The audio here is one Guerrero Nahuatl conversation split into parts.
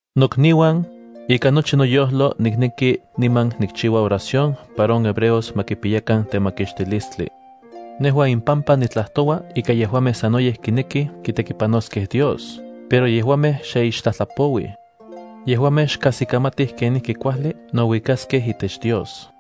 Nokniuan, ikan nochi noyojlo nikneki niman nikchiua oración para on hebreos ma kipiyakan temakixtilistli. Nejua impampa nitlajtoua ika yejuamej sanoyej kinekij kitekipanoskej Dios pero yejuamej xe ixtlajtlapouij. Yejuamej xkajsikamatij kenijki kuajli nouikaskej itech Dios.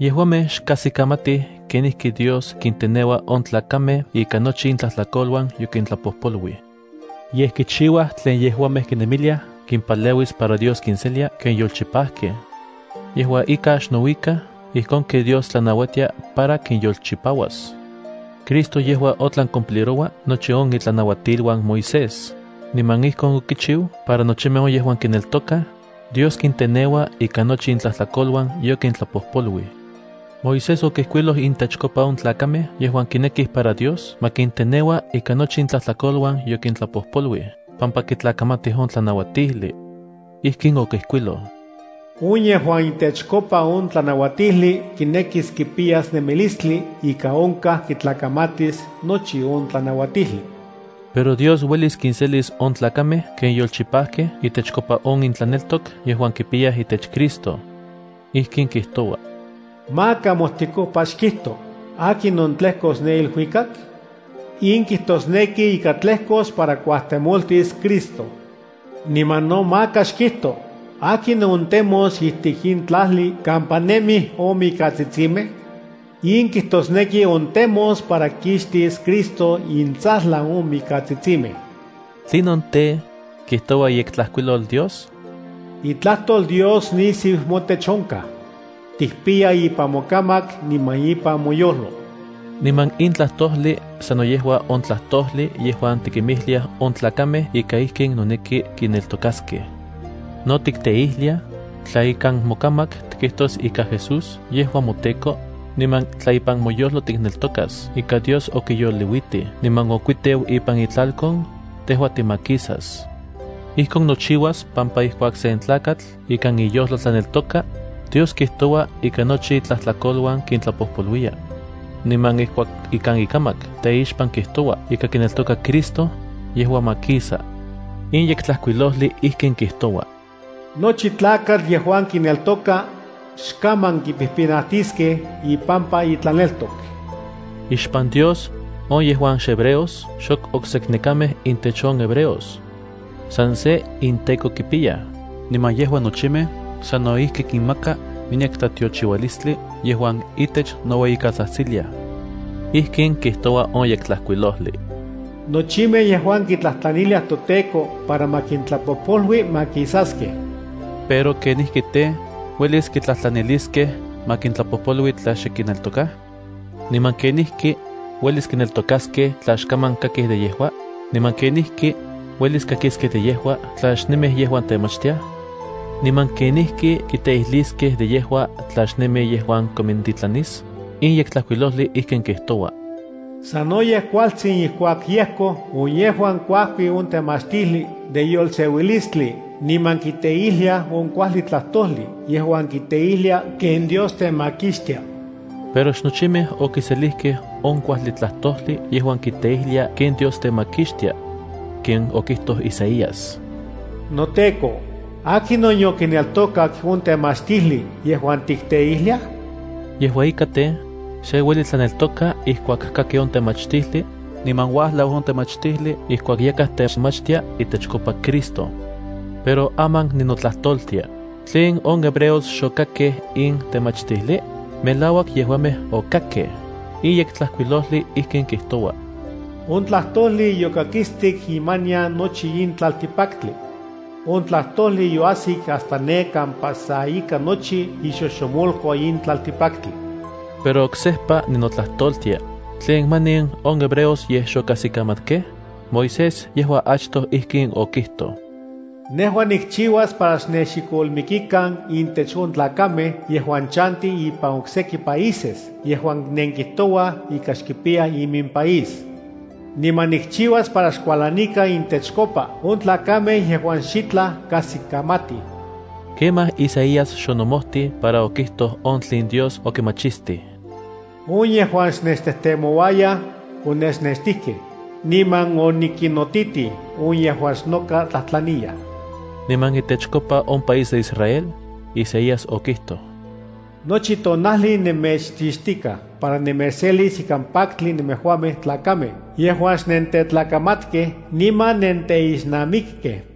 Yejuamej xkajsikamantij kenijki Dios kinteneua on tlakamej ika nochi intlajtlakoluan yokintlapojpoluij. Yej kichiuaj tlen yejuamej kinemiliaj kimpaleuis para Dios kinselia ken yolchipajkej. Yejua ika, xnouikaj ijkon ken Dios tlanauatia para kinyolchipauas. Cristo yejua otlan cumpliroua nochi on itlanauatiluan Moisés, niman ijkon okichiu para nochimej on yejuan kineltokaj, Dios kinteneua ika nochi intlajtlakoluan yokintlapojpoluij. Moisés okijkuiloj intechkopa on tlakamej yejuan kinekij para Dios ma kinteneua ika nochi intlajtlakoluan yokintlapojpoluij pampa kitlakamatij on tlanauatijli. Ijkin okijkuiloj: “On yejuan intechkopa on tlanauatijli kinekis kipiyas nemilistli ika onkaj kitlakamatis nochi on tlanauatijli.” Pero Dios uelis kinselis on tlakamej ken yolchipajkej itechkopa on intlaneltok yejuan kipiyaj itech Cristo. Ijkin kijtoua: “Maka mojtikopa xkijto: ¿akinon tlejkos ne iluikak?” In kijtosneki ika tlejkos para kuajtemoltis Cristo. Niman no maka xkijto: ¿Akinon ontemos ijtik in tlajli kampa nemij on mikatsitsimej? In kijtosneki ontemos para kixtis Cristo intsajlan on mikatsitsimej. ¿Tlinon tej, kijtoua iYektlajkuilol Dios? “Itlajtol Dios nisiu motech onkaj. Tikpiya ipan mokamak niman ipan moyojlo.” Niman in tlajtojli sano yejua on tlajtojli yejuan tikimijliaj on tlakamej ika ijkin noneki kineltokaskej. No tikteijliaj: “Tla ikan mokamak tikijtos ika Jesús yejua moTEKO, niman tla ipan moyojlo tikneltokas ika Dios okiyoliuitij niman okuiteu ipan itlalkon, tejua timakisas.” Ijkon nochiuas pampa ijkuak sen tlakatl ikan iyojlo tlaneltoka, Dios kijtoua ika nochi itlajtlakoluan kintlapojpoluiya. Niman ijkuak ikan ikamak teixpan kijtoua ika kineltoka Cristo, yejua makisa. In Yektlajkuilojli ijkin kijtoua: “Nochi tlakatl yejuan kineltoka, xkaman kipijpinatiskej ipampa itlaneltok.” Ixpan Dios, on yejuan xhebreos xok okseknekamej intech on hebreos. San se inTEKO kipiyaj niman yejua nochimej sano ijki kinmaka miyek tlatiochiualistli yejuan itech noueyikatsajtsiliaj. Ijkin kijtoua on Yektlajkuilojli: “Nochimej yejuan kitlajtlaniliaj toTEKO para ma kintlapojpolui makisaskej.” Pero ¿kenijki tej, uelis kitlajtlaniliskej ma kintlapojpolui tla xe kineltokaj? ¿Niman kenijki uelis kineltokaskej tla xkaman kakij de yejua? ¿Niman kenijki uelis kakiskej de yejua tla xnemij yejuan temachtiaj? ¿Niman kenijki kiteijliskej de yejua tla xnemi yejuan konmintitlanis? In Yektlajkuilojli ijkin kijtoua: “Sanoyej kualtsin ijkuak yejkoj on yejuan kuajkij on temachtijli de yolseuilistli niman kiteijliaj on kuajli tlajtojli yejuan kiteijlia ken Dios temakixtia.” Pero xnochimej okiselijkej on kuajli tlajtojli yejuan kiteijlia ken Dios temakixtia. Ken okijtoj Isaías: “NoTEKO, ¿akinon yokineltokak on temachtijli yejuan tikteijliaj?” Yejua ika tej, se ueli tlaneltoka ijkuak kaki on temachtijli niman uajlau on temachtijli ijkuak yakaj techmachtia itechkopa Cristo. Pero aman ninotlajtoltia: ¿Tlen on hebreos xokakkej in temachtijli? ¡Melauak yejuamej okakkej! In Yektlajkuilojli ijkin kijtoua: On tlajtojli yokakistik imanian nochi in tlaltikpaktli. On tlajtojli yoajsik hasta ne kampa sa ika nochi ixojxomolco in tlaltikpaktli. Pero oksejpa ninotlajtoltia: ¿tlen manin on hebreos yej xokajsikamatkej? Moisés yejua achtoj in okijtoj: Nejua nikchiuas para xnexikolmikan intech on tlakamej yejuan chantij ipan okseki países yejuan nenkijtouaj ika xkipiyaj iminpaís. Niman nikchiuas para xkualanikan intechkopa on tlakamej yejuan xitlaj kajsikamatij. Kemaj Isaías xonomojtij para okijtoj on tlen Dios okimachistij: On yejuan xnechtejtemouayaj, onechnextijkej; niman onikinnotitij on yejuan xnoka tlajtlaniyaj. Niman itechkopa on país de Israel, Isaías okijtoj: “Nochi tonajli nemechchixtikaj para nemechselis ikan paktli nemejuamej tlakamej yejuan xnentetlakamatkej niman nenteixnamikkej.”